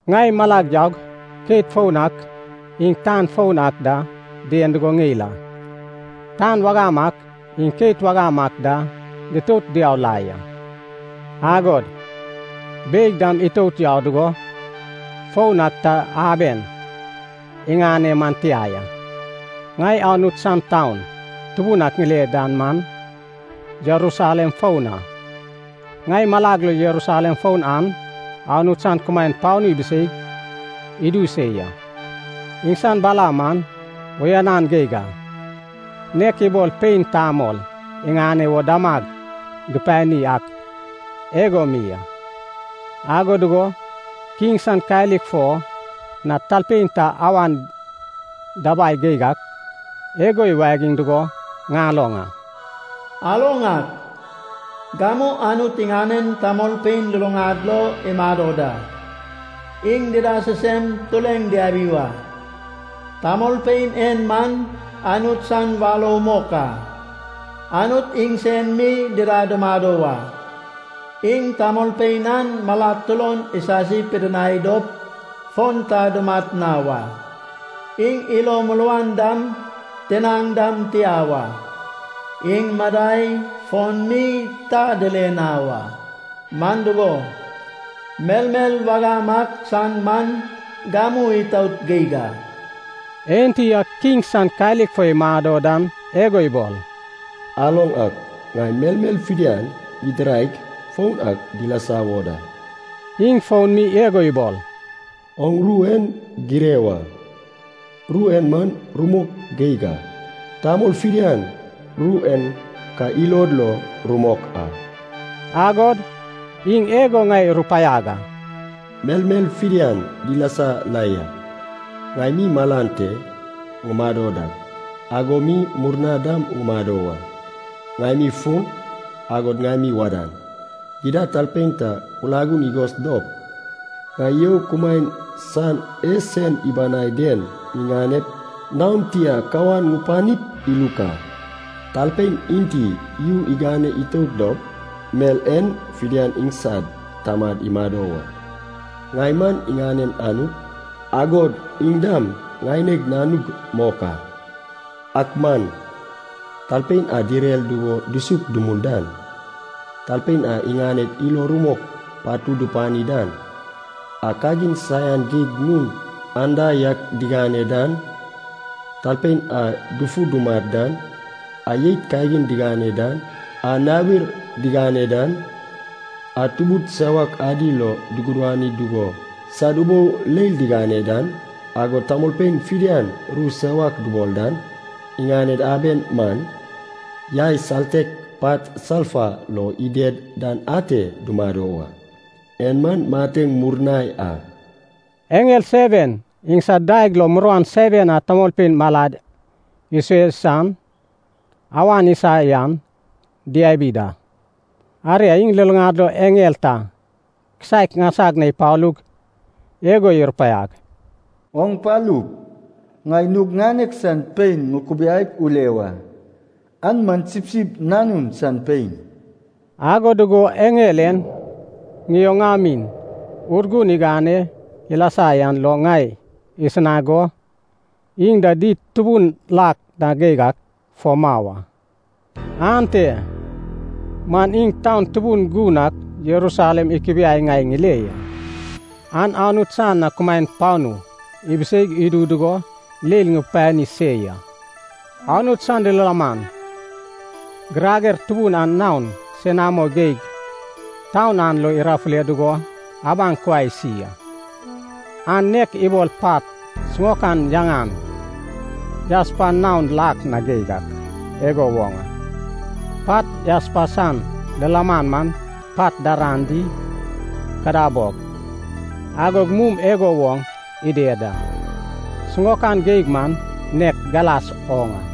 Ŋai malag yaug keit foun ak iŋ tan foun ak da dien dugo ŋeil a. Tan wagam ak iŋ keit wagam ak da ditout diau la ya, agod beig dam itout yau dugo foun ak ta aben iŋane man tia ya. Ŋai Anut san taun tubun ak ŋile dan man, Jerusalem foun a. Ŋai malag lo Jerusalem foun an Anut san kumaen panu ibiseig idu se ya. Iŋsan bala man uyanan geig a, nek ibol pein tamol iŋane wo damag dupani ak igo mi a. Ago dugo kiŋ san kalik fo na talpein ta awan dabai geig ak, igo iwagiŋ dugo ŋaloŋ a. “Aloŋ ak, gamu Anut iŋanen tamolpein luluŋad lo imado da. Iŋ dida sisem tureŋ diabi wa. Tamolpein en man Anut san warou mok a. Anut iŋsen mi dida dumado wa. Iŋ tamolpein an malad turon isasi pidinai dop fon ta dumat na wa. Iŋ ilo muruan dam tinaŋ dam tia wa. Iŋ madai fon mi ta dile na wa. Man dugo, melmel wagam ak san man gamu itout geig a.” Enti a kiŋ san kalik fo imado dan igo ibol, “Aloŋ ak, ŋai melmel fidian ŋidiraig foun ak dilasa wo da.” Iŋ fon mi igo ibol, “Oŋ ru en gire wa. Ru en man rumok geig a. Tamol fidian ru en ka ilod lo rumok a.” Agod iŋ igo ŋai irupaiag a, “Melmel fidian dilasa la ya. Ŋai mi malan te ŋumado dak, ago mi murna dam ŋumado wa. Ŋai mi fun, agod ŋai mi wadan. Gidad talpein ta kulagun igos dop, ŋai you kumaen san e sen ibanai den ŋiŋanep, naon tia kawan ŋupanip iluk a. Talpein enti yu igane itout dop mel en fidian iŋsad tamad imado wa. Ŋai man iŋanen Anut, agod iŋ dam ŋaineg nanug mok a. Ak man, talpein a direr dugo dusuk dumul dan, talpein a iŋaned ilo rumok patud dupani dan, a kagin saian geig nun anda yak digane dan, talpein a dufu dumat dan, a jeit kagin digane dan, a nawir digane dan, a tubud sewak adi lo dugudani dugo sad ubou leil digane dan, agod tamolpein fidian ru sewak dubol dan, iŋaned aben man, yai saltek pat salfa lo ided dan ate dumado wa. En man mateŋ murnai a.” Eŋel seven iŋsad daeg lo muruan seven a tamolpein malad isue san awan isa yan diabi da. Aria iŋ luluŋad lo eŋel ta kisaek ŋaisag na ipalug igo irupaiag, “Oŋ palup, ŋai nug ŋanek san pein ŋukubiaip ule wa, an man Sipsip Nanun san pein.” Ago dugo eŋel en, ŋioŋamin Urgun igane ilasa yan lo ŋai isinag go, iŋ da did tubun lak na geig ak fo mau a. Ante man iŋ taun tubun gun ak Jerusalem ikubiaig ŋai ŋile ya. An Anut san na kumaen panu ibiseig idu dugo leil ŋupani se ya. Anut san lilaman girager tubun an naon senamo geig taun an lo irafule dugo abaŋ kuai isi a. An nek ibol pat siŋaokan yaŋan jaspa naon lak na geig ak igo woŋ a. Pat jaspa san lilaman man pat daran di kadabog, agod mum igo woŋ ided da, siŋaokan geig man nek galas oŋ a.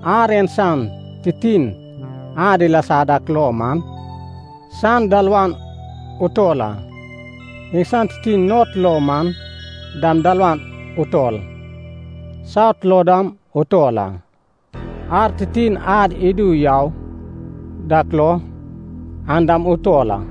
Ar en san titin ad ilasa dak lo man, san dalawan utol a. Iŋsan titin not lo man dam dalawan utol, saut lo dam utol a. Ar titin ad idu yau dak lo an dam utol a.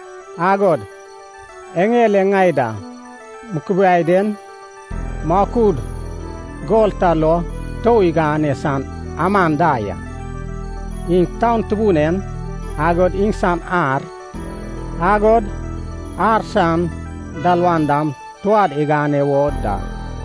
Agod eŋel e ŋai da mukubiai den, makud gol ta lo tou igane san aman da ya. Iŋ taun tubun en, agod iŋsan ar, agod ar san dalawan dam touad igane wo da.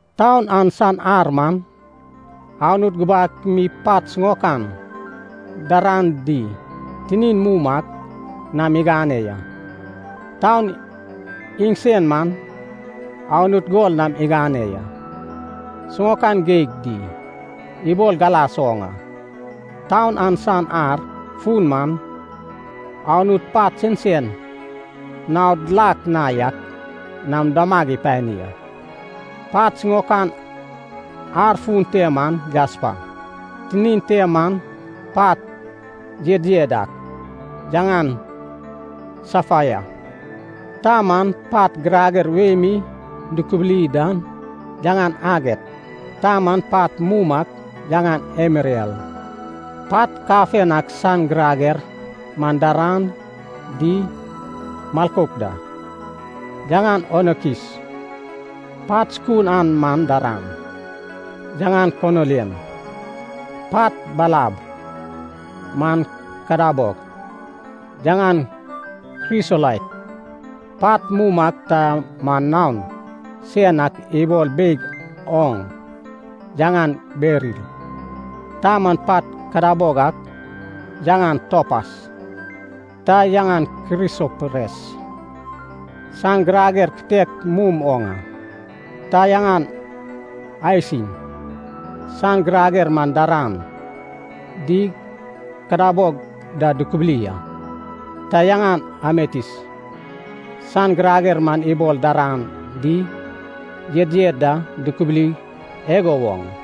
Taun an san ar man, Anut gubak mi pat siŋaokan daran di tinin mum ak nam igane ya. Taun iŋsen man Anut gol nam igane ya, siŋaokan geig di ibol galas oŋ a. Taun an san ar fun man, Anut pat sensen naod lak na yak nam damag ipani a. Pat siŋaokan ar fun te man jaspa. Tinin te man pat yedyed ak yaŋan safaya. Ta man pat girager wei mi dukubuli dan yaŋan aget. Ta man pat mum ak yaŋan emeral. Pat kafen ak san girager man daran di milkouk da, yaŋan onikis. Pat sukun an man daran, yaŋan konilian. Pat balab man kadabog, yaŋan krisolait. Pat mum ak ta man naon sen ak ibol beig oŋ yaŋan beril. Ta man pat kadabog ak yaŋan topas. Ta yaŋan krisopres, san girager kitek mum oŋ a. Ta yaŋan aiasin, san girager man daran di kadabog da dukubuli a. Ta yaŋan ametis, san girager man ibol daran di yedyed da dukubuli igo woŋ a.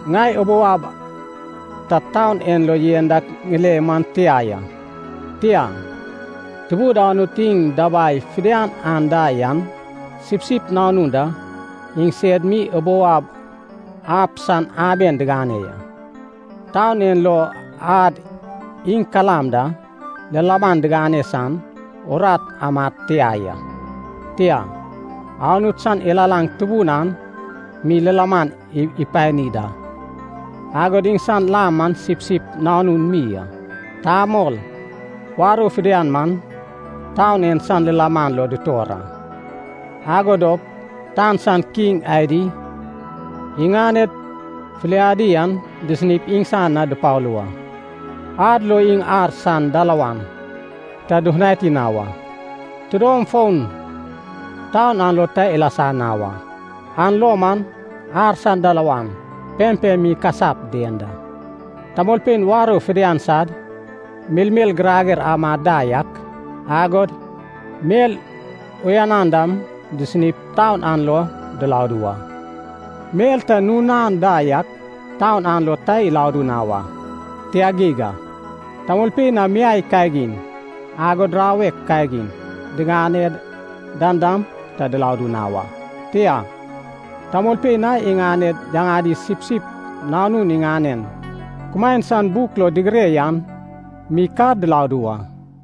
Ŋai ubou ab ta taun en lo yen dak ŋile man tia ya. Tia, Tubud Anut iŋ dabai fidian anda yan, Sipsip Nanun da iŋsed mi ubou ab san aben diŋane ya. Taun en lo ad iŋ kalam da lilaman digane san urat amad tia ya. Tia, Anut san ilalaŋ tubun an mi lilaman ipani da. Agod iŋsan lam man Sipsip Nanun mi a. Tamol warou fidian man taun en san lilaman lo dutor a. Ago dop tan san kiŋ adi iŋaned filiadi an disinip iŋsan na dupalu wa. Ad lo iŋ ar san dalawan ta dufutani na wa. Tidom fon taun an lo ta ilasa na wa, an lo man ar san dalawan pempem mi ikasap dien a. Tamolpein warou fidian sad melmel girager amad da yak, agod mel uyanan dam disinip taun an lo diladu wa. Mel ta nun anda yak taun an lo ta iladu na wa, tia geig a. Tamolpein a miai kagin, agod rawek kagin digane dan dam ta diladu na wa. Tia, tamolpein a iŋaned yaŋadi Sipsip Nanun iŋanen kumaen san buk lo digire yan mi ka diladu wa.